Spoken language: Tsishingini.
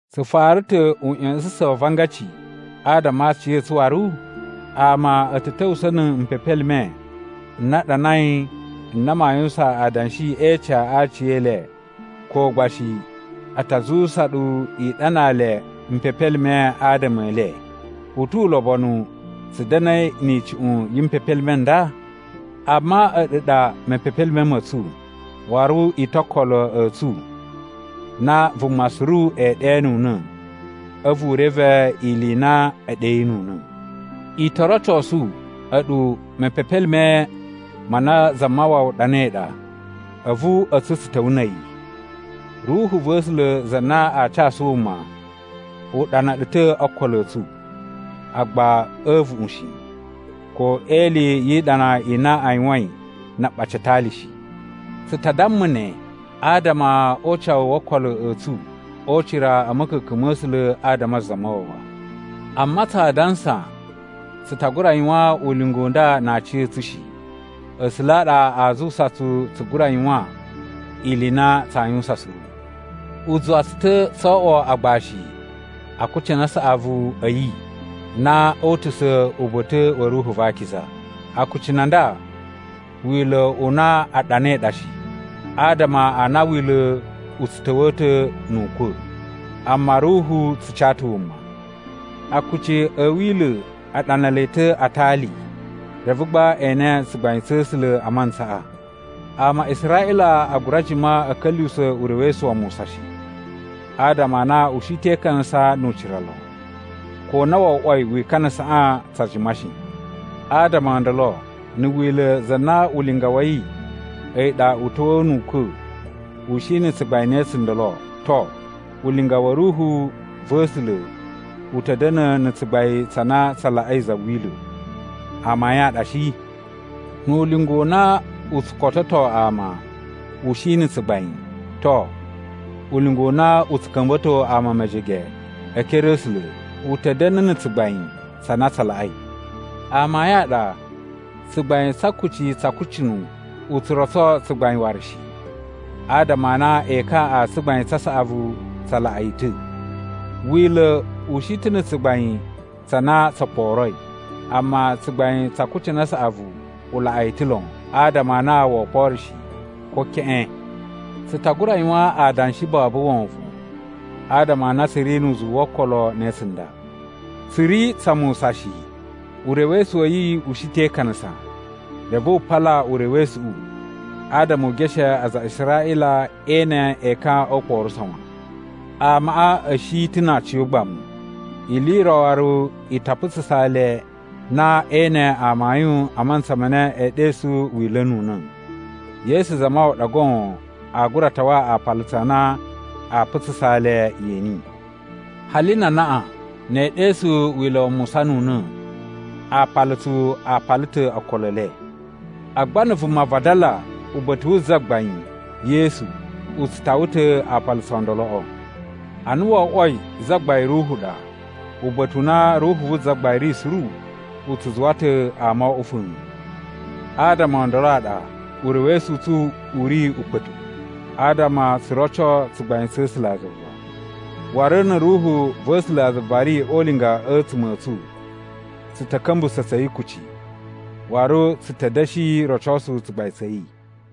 Tsu fara ta̱ uꞌya̱sa̱sa̱n wa avangaci adama a aciya̱tsu waru? Ama a̱ ta̱ ta̱wusa̱ na̱ mpepelime n na a ɗanai n na maa yuwusan adanshi e ica a aciyele ko gba shi a ta zuwusa ɗu i ɗanaa le mpepelime adama e le. U tu ulobonu tsu da̱na̱i ni icuꞌun yi mpepelime n nda? Amma a̱ɗu ɗa mepepelime ma̱ tsu, waru i ta̱ o okolo a̱ tsu na vuma suru ee ɗenuna̱ a̱vu u reve ili i na e ɗeyinuna̱. I to rocosu a̱ɗu mepepelime ma na Zamawawa ɗanai ɗa, a̱vu a̱tsu tsu ta̱wa̱ na̱ a̱yi. Ruhu va̱ A̱sula̱ za na aa casu wuma, u ɗana ɗu ta̱ o okolo a̱ tsu, agba a̱ a̱a̱vuꞌun shi, ko e ili yi iɗana i na a yuwain na aɓaci a atali shi. Tsu ta damma ne adama o ucawu wo okolo a̱ tsu o ucira a̱ ma̱ka̱ka̱n ma̱ A̱sula̱ adama a Zamawawa. Amma tsa dansa tsu ta gura yuwan ulinga u nda na aciya̱tsu shi. A̱sula̱ a ɗa a zuwusa tsu tsu gura yuwan ili i na tsaa yuwusan suru. U zuwa tsu ta̱ tso oꞌwo agbashi a akucunu a saꞌavu a̱ yi na o utusa̱ uba̱ta̱ wa̱ Ruhu va Akiza. Akucunu a nda Wila̱ u na a ɗanai ɗa shi, adama a na Wila̱ u tsu ta̱wa̱a̱ ta̱ nu ukwa̱, amma Ruhu tsu ca ta̱ wuma. Akuci a̱ Wila̱ a ɗana le ta̱ a atali, reve gba e ene tsugbain tsa̱ A̱sula̱ a mantsaꞌa. Ama a Israꞌila a gura jima a̱ ka̱lyuwusa̱ urewesu wa Musa shi, adama a na u shi te ikanasa nu ucira lon, ko na wo oꞌwoi wikanasaꞌa tsa jima shi. Adama o ndolo, na̱ Wila̱ za na ulinga wa̱ yi a̱yi ɗa u ta̱wa̱a̱ nu ukwa̱ u shi na̱ tsugbain ne tsundolo, to, ulinga wa̱ Ruhu va̱ A̱sula̱ u ta̱ da̱na̱ na̱ tsugbain tsa na tsa laꞌai za Wila̱. Amayun a ɗa shi? Nu ulinga u na u tsu kototo ama u shi na̱ tsugbain, to, ulinga u na u tsu ka̱mba̱to ama mejege e ekere a̱ A̱sula̱ u ta̱ da̱na̱ na̱ tsugbain tsa na tsa laꞌai. Amayun a ɗa tsugbain tsa akuci tsa akucunu u tsu rotso tsugbain waru shi, adama a na ekan a tsugbain tsa saꞌavu tsa laꞌa yi ta̱. Wila̱ u shi ta̱ na̱ tsugbain tsa na tso kporoi. Amma tsugbain tsa akucunu a saꞌavu u laꞌa yi ta̱ lon, adama a na woo kporo shi, ko keꞌen. Tsu ta gura yuwan adanshi babu wovon adama a na tsu ri nu uzuwu wo okolo ne tsunda. Tsu ri tsa Musa shi. Urewesu wa̱ yi u shi te ikanasa, reve wu pala urewesuꞌu adama u geshe aza a Israꞌila e ene ekan o ukporuso wan. Amaꞌa a̱ shi ta̱ na aciyogbamu, ili i ro waru i ta putsusa le na ee ene amayun a mantsa ma na e ɗesu Wila̱ nu una̱. Yesu Zamawawa ɗa goon a gura tawa apalutsu a na aa putsusa le yeni. Hali na anaꞌan, ne ee ɗesu Wila̱ wa Musa nu una̱, aapalutsu a pala ta̱ okolo e le. Agba na̱ vuma vadala uba̱ta̱ wu Zagbain (Yesu), u tsu tawa ta̱ aapalutsu o ndoloꞌo. Ana wo oꞌwoi Zagbain Ruhu ɗa, uba̱ta̱ u na Ruhu vu Zagbain ri suru, u tsu zuwa ta̱ ama o oꞌwo fa̱a̱n. Adama o ndolo a ɗa urewesu u tsu u ri ukpa̱tuꞌu adama tsu roco tsugbain tsa̱ A̱sulazuva. Waru na̱ Ruhu va̱ A̱sulazuva ri o ulinga a̱tsuma̱ a̱ tsu, tsu ta̱ ka̱mbusa̱ tsa̱ yi kuci, waru tsu ta̱ da̱shi rocosu tsugbain tsa̱ yi.